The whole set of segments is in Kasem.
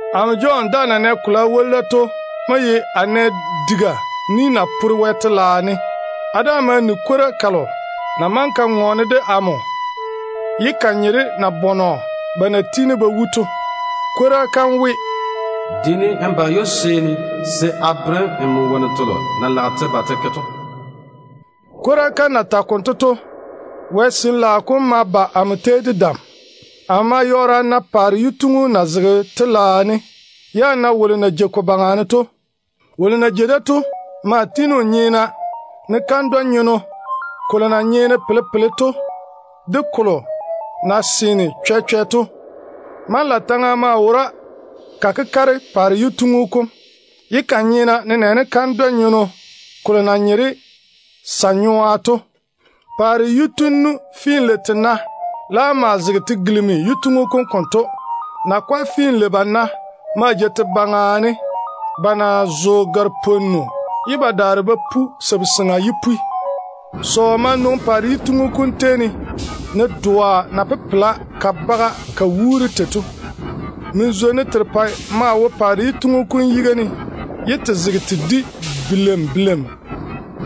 Amo Jɔn daa na nɛ kolo a woli da to mo ye a nɛ diga ni na pore Wɛ telaao ne. A daa ma ni kwora kalo ya na maŋe ka ŋɔɔne de amo ye ka nye de nabɔnɔ ba na tiini ba wu to. Kwora kam we, “Diini n ba ywoba seeni se a bere nmo wonnu telo na lage te ba te ke to.” Kwora kam na tage konto to, Wɛ Sin-laao kom ma ba amo tei de dam. Amo ma yɔɔre a na paare yituŋu na zege telaao ne, ye a na wolo na jei ko baŋa ne to. Wolo na jei da to maa tiini o nyeena, ne kandwɛ-nyeno kolo na nyeene pele-pele to de kolo na seene chwɛ-chwɛ to. kandwa-nyenno = Jasper & Carnelian Manlaataŋa maa wora ka kekare paare yituŋu kom, ye ka nyeena nenɛɛne kandwɛ-nyeno kolo yere na ye Emeraleda to. Paare yitunnu finlei-tena laam maa zege te gilimi yituŋu kom konto. Nakwa finlei-bana maa jei te baŋa ne ba na zo gare-pwonnu ye ba daare ba pu sabu-seŋa yipwi. Pwooni de sɔɔ ma nwoŋi paare yituŋu kom na wo mɛ to, ne doa na pepela ka baga ka wuuri tei to. Mɔɔla yarepɛ maa wo paare yituŋu kom yiga ne ye te zege te di bileim-bileim.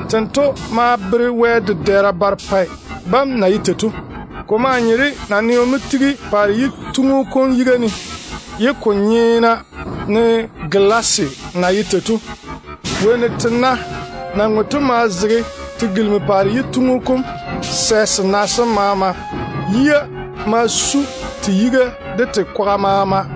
Tento mo bere Wɛ dedɛɛra barepɛ bam na ye tei to. Ko maa nye de naneo mo tigi paare yituŋu kom yiga ne, ye ko nyeena ne gelaase na ye tei to. Wonnu tena na ŋwe to maa zege te gilimi paare yituŋu kom sɛ sena sem maama. Yia ma faare te yiga de te kwaga maama.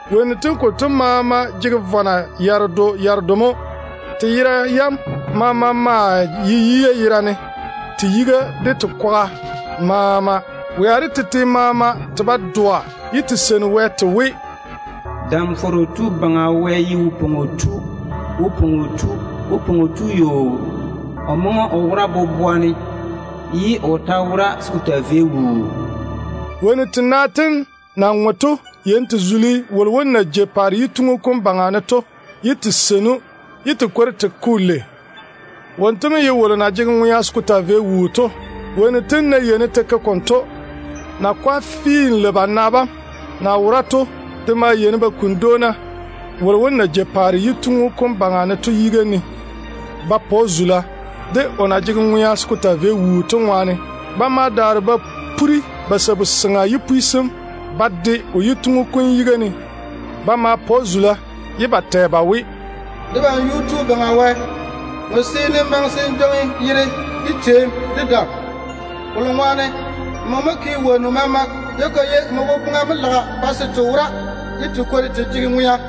Wonnu tem konto maama jege vɔna yaredo yaredo mo. Te yera yam maama maa ye yia yerane te yiga de te kwaga maama. Wea de tete maama te ba dɔa ye te seini Wɛ te we: “Dam-fɔrɔ Tu Baŋa Wɛ ye wo-pwoŋo tu mo. O maa yɔɔre o ye wose ye o dwoŋi tera. O maŋe o wora mo boboa ne, ye o ta wora zem, se ko taa vei wuu.” Wonnu tena tem na ŋwe to yeini te zuli wolo wom na jei paare yituŋu kom baŋa ne to, ye te seini‑o, ye te kwori te ke‑o lei. Wonto mo ye wolo na jege ŋwea se ko taa vei wuu to. Wonnu tem ná yeini te ke konto, nakwa finlei-bana bam de maa yeini ba kuni dwoona wolo wom na jei paare yituŋu kom baŋa ne to yiga ne ba pa‑o zula, de o na jege ŋwea se ko taa vei wuu to. Ba ma daare ba puri ba sabu-seŋa yipwi sem ba tiŋi o yituŋu kom yiga ne ba ma zuli‑o ye ba tɛ ba we: “Debam Yuu-tu Baŋa Wɛ, nmo seene n maŋe se n jwoŋi zula, de teem, de dam. Kolo ŋwaane nmo mo naane wonnu maama. Ko maa ye nmo tete boboŋa mo laga pa se n ke-te ye n pa te wora.”